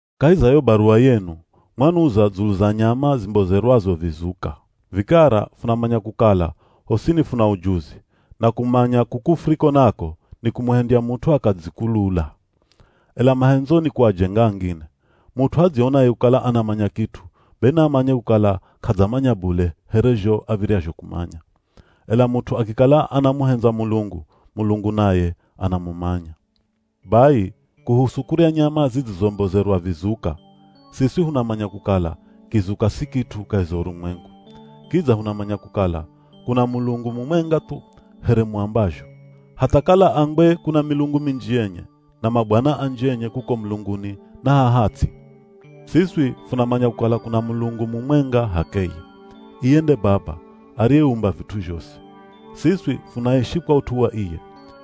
Kahi za yo baruwa yenu, mwanuza dzulu za nyama zimbozerwazo vizuka. Vikara funamanya kukala, “hosini funa ujuzi,” na “kumanya” kuku furiko nako, nikumuhendya mut'u akadzikulula. Ela mahendzo ni kuajenga angine. Mut'u adzionaye kukala anamanya kit'u, be naamanye kukala k'adzamanya bule here zho av̱iryazho kumanya. Ela mut'u akikala anamuhendza Mulungu, Mulungu naye anamumanya. Bai, kuhusu kurya nyama zidzizombozerwa vizuka. Siswi hunamanya kukala, “kizuka si kit'u kahi za urumwengu.” Kidza hunamanya kukala, “kuna Mulungu mumwenga thu” here muambazho. Hatha kala ambwe kuna milungu minji yenye, na mabwana anji enye kuko mulunguni na haha ts'i, siswi funamanya kukala kuna Mulungu mumwenga h'akeye. Iye nde Baba, ariyeumba vit'u zhosi. Siswi funaishi kwa ut'u wa iye.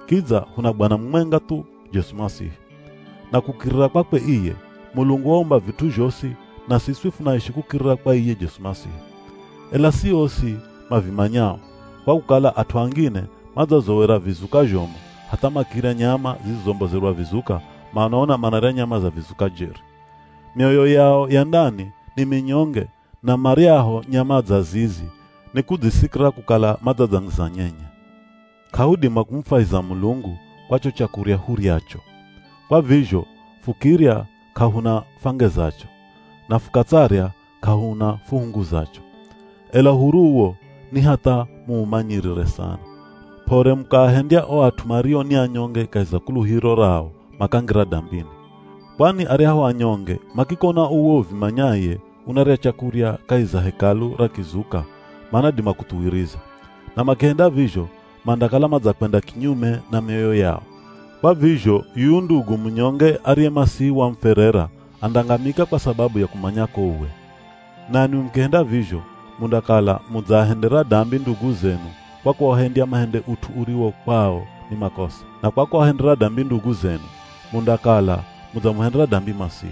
Kidza, huna Bwana mumwenga thu, Jesu Masihi. Na kukirira kwakwe iye, Mulungu waumba vit'u zhosi na siswi funaishi kukirira kwa iye Jesu Masihi. Ela si osi mavimanyao, kwa kukala at'u angine madzazowera vizuka zhomu hatha makirya nyama zidzizombozerwa vizuka, manaona manarya nyama za vizuka jeri. Myoyo yao ya ndani ni minyonge na maryaho nyama dza zizi nikudzisikira kukala madzadzangiza nyenye. K'ahudima kumufwahiza Mulungu kwa cho chakurya huryacho. Kwa vizho fukirya k'ahuna fwangezacho, na fukatsarya k'ahuna fuhunguzacho. Ela uhuru uwo ni hatha muumanyirire sana, p'ore mukaahendya o at'u mario ni anyonge kahi za kuluhiro rao makangira dambini. Kwani aryahu anyonge makikona uwe uvimanyaye unarya chakurya kahi za Hekalu ra kizuka manadima kuthuwiriza. Na makihenda vizho mandakala madzakwenda kinyume na mioyo yao. Kwa vizho yuyu ndugu munyonge ariye Masihi wamufwerera andangamika kwa sababu ya kumanyako uwe. Nanwi mukihenda vizho mundakala mudzaahendera dambi ndugu zenu kwa kuahendya mahende ut'u uriwo kwao ni makosa. Na kwa kuahendera dambi ndugu zenu, mundakala mudzamuhendera dambi Masihi.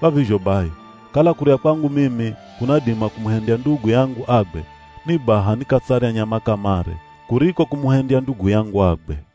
Kwa vizho bai, kala kurya kwangu mimi kunadima kumuhendya ndugu yangu agwe, ni baha nikatsarya nyama kamare kuriko kumuhendya ndugu yangu agwe.